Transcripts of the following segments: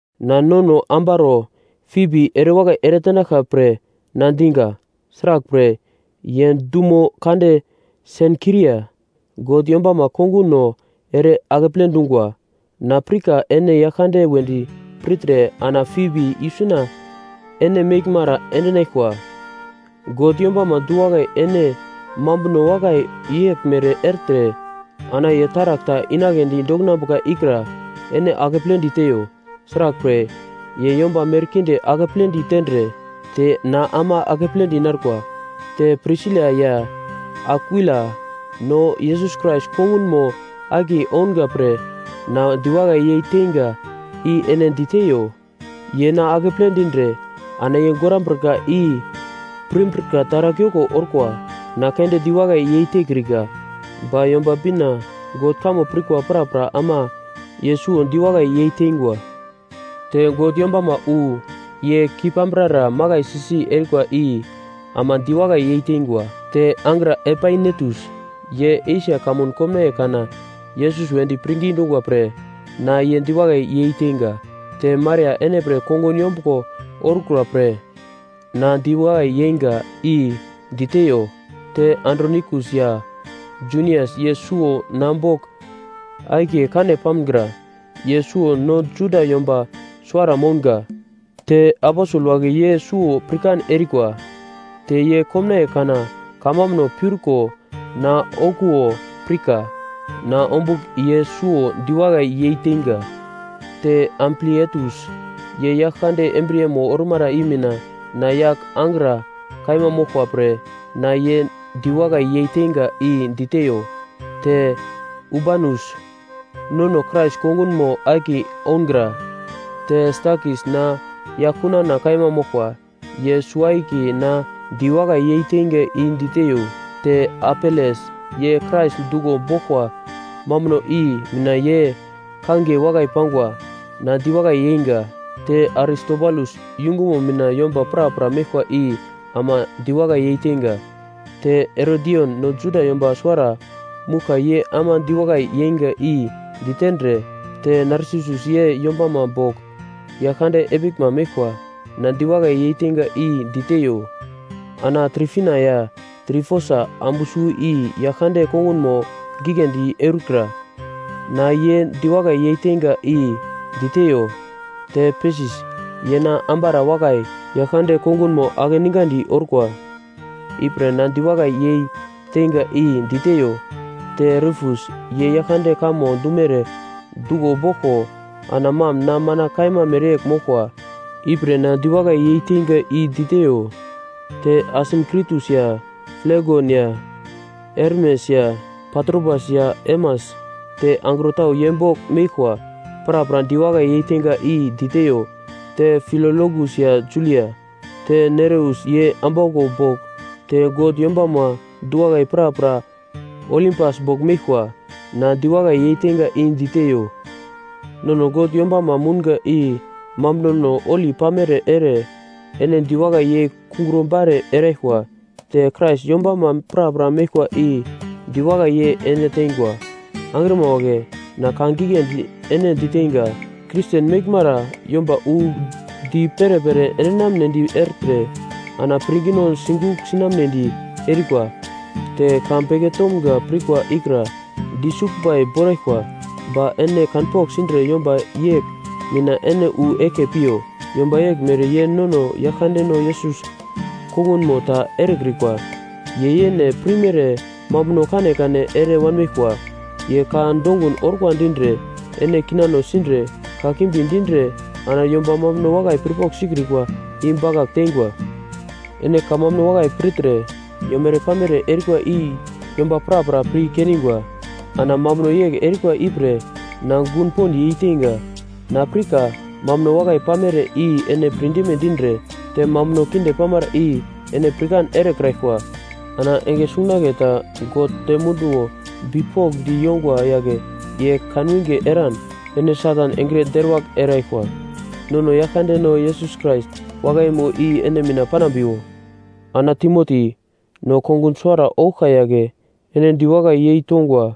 Na nono ambaro Fibi erewakai eretenaglkwa pre na diga. Sraglpre, ye dumo kande Senkria God yombama konguno ere akeple dungwa. Na pirka ene Yaglkande wedi pirtre ana Fibi isuna ene meglmara endinaglkwa. God yombama du-wakai ene mambuno wakai yeglmere ertre ana ye taragl ta inagledi dokinambuka ikra ene akepledi teiyo. Sraglpre, ye yomba merkinde akepledi tendre te na ama akepledi narkwa. Te Prisila ya Akwila, no Yesus Krais kongunmo akiye ounga pre na diwakai yeiteinga i ene diteiyo. Ye na akeple dindre ana ye gorambrika i pirmbrika taragl yoko orkwa. Na keunde diwakai yeitekrika, ba Yomba Bina God kamo pirkwa prapra ama ye suwo diwakai yeiteingwa. Te God yombama wu ye kei-pambrara makaisi si erikwa i ama diwakai yeiteingwa. Te angra Epainetus, ye Esia kamun komnaiye kana Yesus wedi pirngi dungwa pre na ye diwakai yeiteinga. Te Maria ene pre kongun yombuglo orkura pre na diwakai yeinga i diteiyo. Te Andronikus ya Junias, ye suwo na bogl akiye kane pamgra. Ye suwo no Juda yomba suwara mounga, te aposel wagle ye suwo pirkan erikwa, te ye komnaiye kana kamambuno piurko na okuwo pirka. Na ombugl ye suwo diwakai yeiteinga. Te Amplietus, ye Yaglkande embriyemo ormara i mina na yagl angra kaima moglkwa pre na ye diwakai yeiteinga i diteiyo. Te Urbanus, nono Krais kongunmo akiye oungra. Te Stakis na yaglkunana kaima moglkwa. Ye suwo-akiye na diwakai yeiteinga i diteiyo. Te Apeles, ye Krais duglo boglkwa mambuno i mina ye kangiye wakai pangwa. Na diwakai yeinga. Te Aristobulus yungumo mina yomba prapra meglkwa i ama diwakai yeiteinga. Te Herodion, no Juda yomba suwara mouglka ye ama diwakai yeinga i ditendre, te Narsisus, ye yombama bogl Yaglkande epiglma meglkwa, na diwakai yeiteinga i diteiyo. Ana Trifina ya Trifosa, ambu suwo i Yaglkande kongunmo giglendi eurikra, na ye diwakai yeiteinga i diteiyo. Te Persis, ye na ambara wakai, Yaglkande kongunmo akeningandi orkwa, ipre na diwakai yei teinga i diteiyo. Te Rufus ye Yaglkande kamo dumere duglo boglko ana mam na mana kaima mereyegl moglkwa. Ipre na diwakai yeiteinga i diteiyo. Te Asinkritus ya Flegon ya Hermes ya Patrobas, ya Hermas, te angro tau ye bogl meglkwa, prapra diwakai yeiteinga i diteiyo. Te Filologus ya Julia, te Nereus ye ambauglo bogl, te God yombama du-wakai prapra Olimpas bogl meglkwa, na diwakai yeiteinga i diteiyo. Nono God yombanma mounga i mambunono holi pamere ere ene diwakai yei kungro bare eraglkwa. Te Krais yombama prapra meglkwa i diwakai yei ene tengwa. Angrima wagle, na ka giglendi ene diteinga, Kristen meglmara yomba wu di perepere endinamnedi ertre ana pirngino sigugl sinamnedi erikwa, te ka beke tomga pirkwa ikra disuglbai boraglkwa, ba ene kanpogl sindre yomba yegl mina ene wu eglke piyo. Yomba yeglmere ye nono Yaglkandeno Yesus kongunmo ta erekrikwa. Ye yene pirmere mambuno kanekane ere wanmeglkwa. Ye ka dongun orkwa dindre, ene kinano sindre, kakimbi dindre ana yomba mambuno wakai pirpogl sikrikwa i bakagl teingwa. Ene kamambuno wakai pirtre yomere-pamere erikwa i yomba prapra pir kendingwa. Ana mambuno yegl erikwa ipre na gun pond yeiteinga. Na pirka mambuno wakai pamere i ene pirdime dindre, te mambuno kinde pamara i ene pirkan erekraglkwa. Ana enge sungunagle ta God dem munduwo bipokndi yongwa yagle ye kanwinge eran ene Satan engre deruwagl eraglkwa. Nono Yaglkandeno Yesus Krais wakaimo i ene mina panambiwo. Ana Timoti, no kongun suwara ouglka yagle, ene diwakai yeitongwa.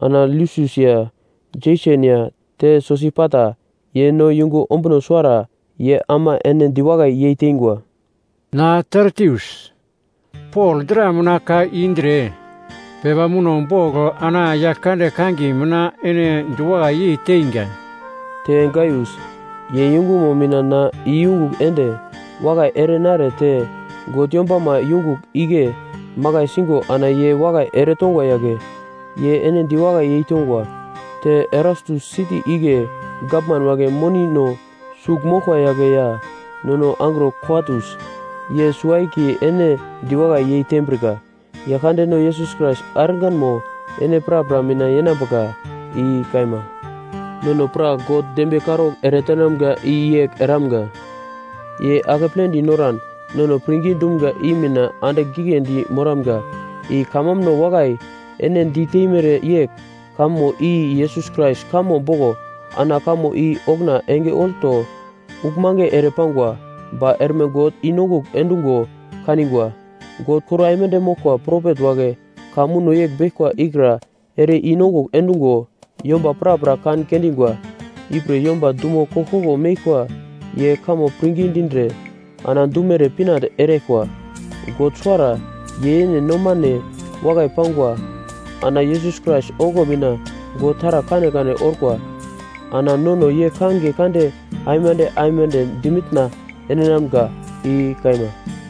Ana Lusius ya Jeson ya te Sosipater, ye no yungu ombuno suwara, ye ama ene diwakai yeiteingwa. Na Tertius, Pol dra mina ka i indre pepa muno bogl ana Yaglkande kangiye mina ene diwakai yeiteingwa. Te Gaius, ye yungumo mina na iyungugl ende wakai ere nare te God yombama yungugl igle makai singo ana ye wakai eretongwa yagle, ye ene diwakai yeitongwa. Te Erastus siti igle gavman wagle monino sugl moglkwa yagle ya nono angro Kwartus, ye suwo-akiye ene diwakai yeitembrika. Yaglkandeno Yesus Krais arganmo ene prapra mina yenambuka. I kaima. Nono pra God dembiye karaugl eretenamga i yegl eramga: Ye akepledi noran nono pirngi dumga i mina andigl giglendi moramga, i kamambuno wakai ene diteimere yegl, kamo i Yesus Krais kamo boglo. Ana kamo i okuna enge olto uglmange ere pangwa, ba erme God i-nongugl endungo kanigwa. God kor aimande moglkwa propet wagle ka muno beglkwa ikra ere i-nongugl endungo yomba prapra kan kendingwa. Ipre yomba dumo koglkoglo meglkwa ye kamo pirngi dindre ana dumere pinande eraglkwa. God suwara, ye yene nomane wakai pangwa. Ana Yesus Krais ongo mina God taragl kanekane orkwa, ana nono ye kangiye kande aimande aimande dimitna endinamga. I kaima.